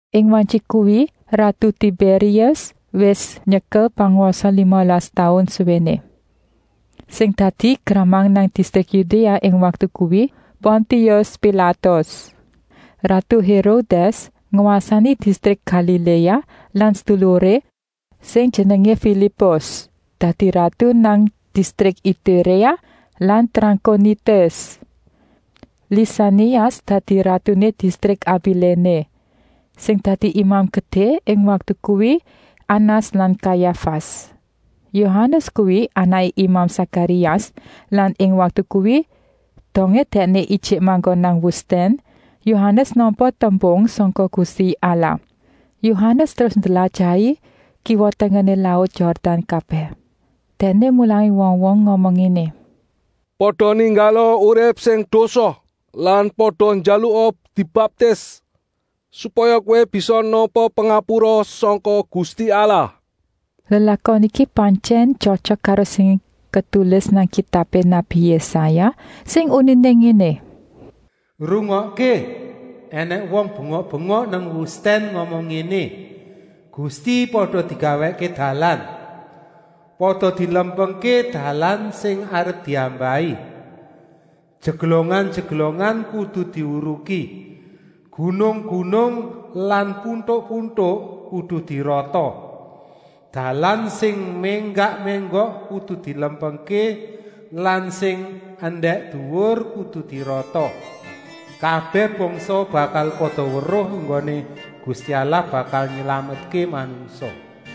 Ing wantyi kuwi ratu Tibérius wis nyekel pangwasa limalas taun suwéné. Sing dadi gramang nang distrik Yudéa ing waktu kuwi Pontius Pilatus. Ratu Hérodès ngwasani distrik Galiléa lan seduluré, sing jenengé Filipus, dadi ratu nang distrik Ituréa lan Trankonitis. Lisanias dadi ratuné distrik Abiléne. Sing dadi Imam Gedé ing waktu kuwi Anas lan Kayafas. Yohanes kuwi anaké imam Sakarias lan ing waktu kuwi, dongé dèkné ijik manggon nang wustèn, Yohanes nampa tembung sangka Gusti Allah. Yohanes terus ndlajahi kiwa-tengené laut Yordan kabèh. Dèkné mulangi wong-wong ngomong ngéné: “Pada ninggala urip sing dosa lan pada njaluka dibaptis, supaya kowé bisa nampa pangapura sangka Gusti Allah!” Lelakon iki pantyèn tyotyok karo sing ketulis nang kitabé nabi Yésaya, sing uniné ngéné: “Rungokké! Enèng wong bengok-bengok nang wustèn ngomong ngéné: ‘Gusti pada digawèkké dalan. Pada dilempengké dalan sing arep diambahi. Jeglongan-jeglongan kudu dihuruki, gunung-gunung lan puntuk-puntuk kudu dirata. Dalan sing ménggak-ménggok kudu dilempengké lan sing endèk-duwur kudu dirata. Kabèh bangsa bakal pada weruh enggoné Gusti Allah bakal nylametké manungsa.’”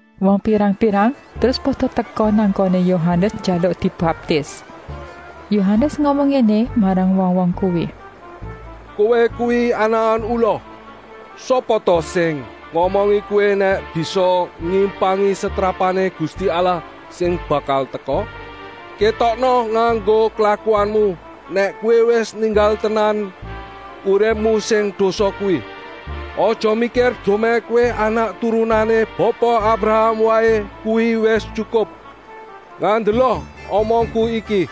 Wong pirang-pirang terus pada teka nang nggoné Yohanes njaluk dibaptis. Yohanes ngomong ngéné marang wong-wong kuwi: “Kowé kuwi anakan ula. Sapa ta sing ngomongi kowé nèk bisa nyimpangi setrapané Gusti Allah sing bakal teka? Kétokna nganggo klakuanmu nèk kowé wis ninggal tenan uripmu sing dosa kuwi. Aja mikir dumèh kowé anak turunané Bapa Abraham waé kuwi wis tyukup. Ngandela omongku iki: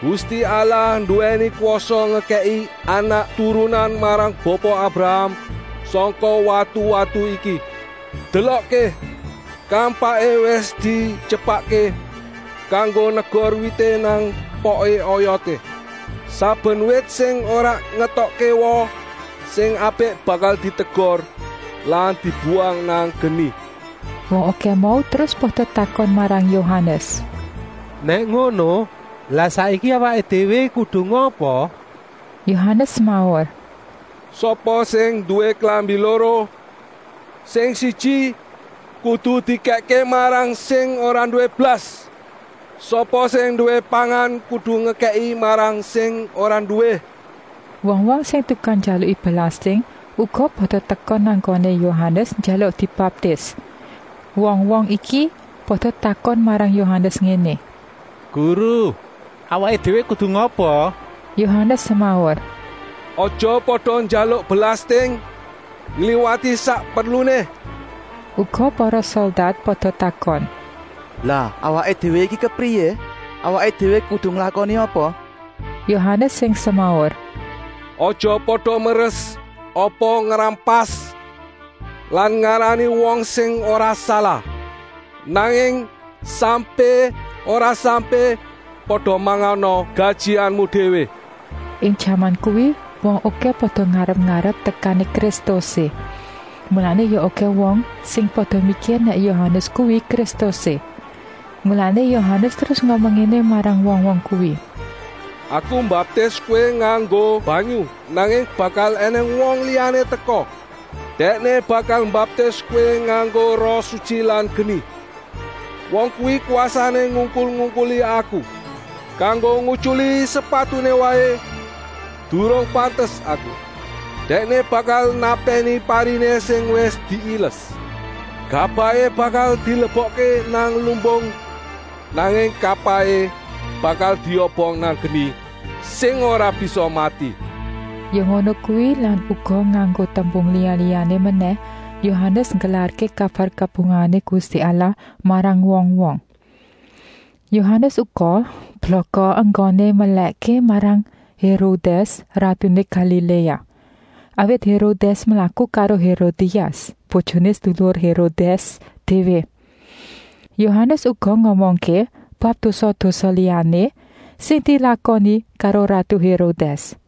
Gusti Allah nduwèni kwasa ngekèki anak-turunan marang Bapa Abraham sangka watu-watu iki. Delokké, kampaké wis dityepakké kanggo negor wité nang poké oyoté. Saben wit sing ora ngetokké woh sing apik bakal ditegor lan dibuwang nang geni.” Wong okèh mau terus pada takon marang Yohanes: “Nèk ngono, lah saiki awaké déwé kudu ngapa?” Yohanes semaur: “Sapa sing nduwé klambi loro, sing siji kudu dikèkké marang sing ora nduwé blas. Sapa sing nduwé pangan kudu ngekèki marang sing ora nduwé.” Wong-wong sing tukang njaluki belasting uga pada teka nang nggoné Yohanes njaluk dibaptis. Wong-wong iki pada takon marang Yohanes ngéné: “Guru, awaké déwé kudu ngapa?” Yohanes semaur: “Aja pada njaluk belasting ngliwati sak perluné.” Uga para soldat pada takon: “Lah awaké déwé iki kepriyé? Awaké déwé kudu nglakoni apa?” Yohanes sing semaur: “Aja pada meres apa ngrampas lan ngarani wong sing ora salah. Nanging sampé ora sampé pada mangana gajihanmu déwé.” Ing jaman kuwi wong okèh pada ngarep-arep tekané Kristusé. Mulané ya okèh wong sing pada mikir nèk Yohanes kuwi Kristusé. Mulané Yohanes terus ngomong ngéné marang wong-wong kuwi: “Aku mbaptis kowé nganggo banyu, nanging bakal ènèng wong liyané teka; Dèkné bakal mbaptis kowé nganggo Roh Sutyi lan geni. Wong kuwi kwasané ngungkul-ungkuli aku. Kanggo ngutyuli sepatuné wongé waé durung pantes aku. Dèkné bakal napèni pariné sing wis diiles. Gabahé bakal dilebokké nang lumbung, nanging kapahé bakal diobong nang geni sing ora bisa mati.” Ya ngono kuwi lan uga nganggo tembung liya-liyané menèh Yohanes nggelarké kabar kabungahané Gusti Allah marang wong-wong. Yohanes uga blaka enggoné melèkké marang Hérodès, ratuné Galiléa. Awit Hérodès mlaku karo Hérodias, bojoné seduluré Hérodès déwé. Yohanes uga ngomongké bab dosa-dosa liyané sing dilakoni karo ratu Hérodès.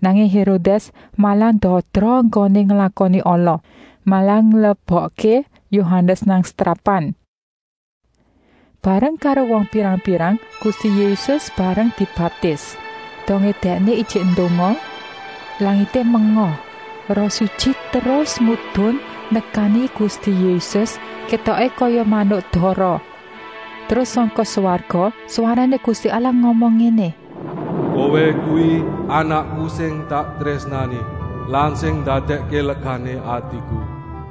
Nanging Hérodès malah ndadra enggoné nglakoni ala, malah nglebokké Yohanes nang setrapan. Bareng karo wong pirang-pirang Gusti Yésus mbarang dibaptis. Dongé Dèkné ijik ndonga, langité menga. Roh Sutyi terus medun nekani Gusti Yésus, kétoké kaya manuk dara. Terus sangka swarga swarané Gusti Allah ngomong ngéné: “Kowé kuwi Anakku sing tak trésnani lan sing ndadèkké legané atiku!”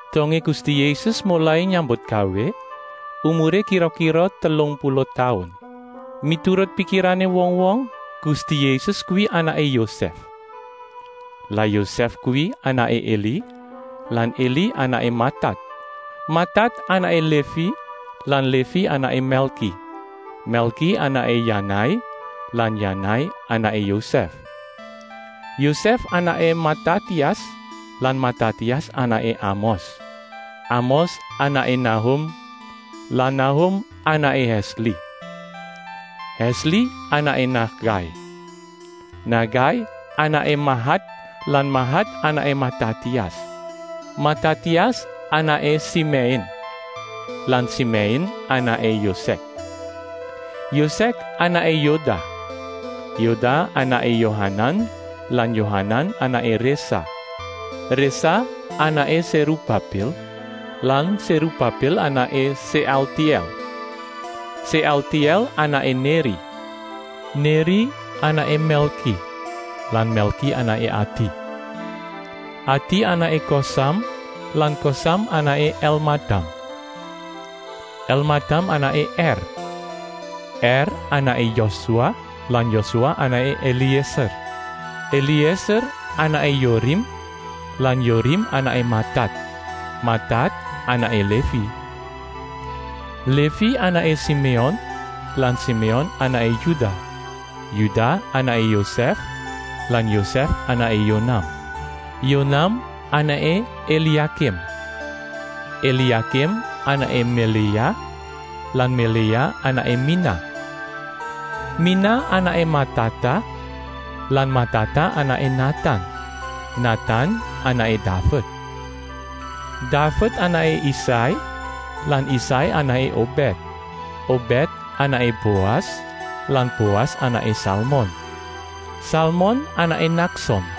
Dongé Gusti Yésus molai nyambutgawé umuré kira-kira telung puluh taun. Miturut pikirané wong-wong Gusti Yésus kuwi anaké Yosèf. Lah Yosèf kuwi anaké Eli lan Eli anaké Matat. Matat anaké Lévi lan Lévi anaké Mèlki. Mèlki anaké Yanai lan Yanai anaké Yosèf. Yosèf anaké Matatias lan Matatias anaké Amos. Amos anaké Nahum lan Nahum anaké Hèsli. Hèsli anaké Nagai. Nagai anaké Mahat lan Mahat anaké Matatias. Matatias anaké Simèin lan Simèin anaké Yosèk. Yosèk anaké Yoda. Yoda anaké Yohanan lan Yohanan anaké Résa. Résa anaké Sérubabil lan Sérubabil anaké Séaltièl. Séaltièl anaké Néri. Néri anaké Mèlki lan Mèlki anaké Adi. Adi anaké Kosam lan Kosam anaké Elmadam. Elmadam anaké Er. Er anaké Yosua lan Yosua anaké Elièser. Elièser anaké Yorim lan Yorim anaké Matat. Matat anaké Lévi. Lévi anaké Siméon lan Siméon anaké Yudah. Yudah anaké Yosèf lan Yosèf anaké Yonam. Yonam anaké Eliakim. Eliakim anaké Meléa lan Meléa anaké Minah. Minah anaké Matata lan Matata anaké Natan. Natan anaké Daved. Daved anaké Isai lan Isai anaké Obèd. Obèd anaké Boas lan Boas anaké Salmon. Salmon anaké Nakson.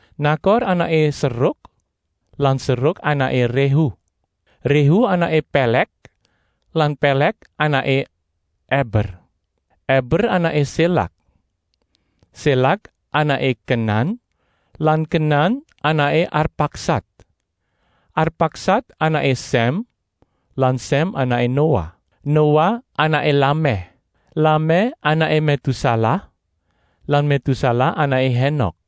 Nakor anaké Seruk lan Seruk anaké Réhu. Réhu anaké Pèlèk lan Pèlèk anaké Eber. Eber anaké Sélak. Sélak anaké Kenan lan Kenan anaké Arpaksad. Arpaksad anaké Sèm lan Sèm anaké Noah. Noah anaké Lamèh. Lamèh anaké Métusalah lan Métusalah anaké Hénok.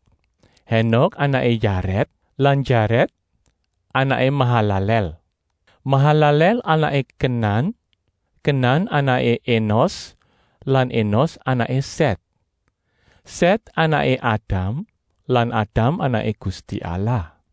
Hénok anaké Yarèd lan Yarèd anaké Mahalalèl. Mahalalèl anaké Kenan. Kenan anaké Enos lan Enos anaké Sèt. Sèt anaké Adam lan Adam anaké Gusti Allah.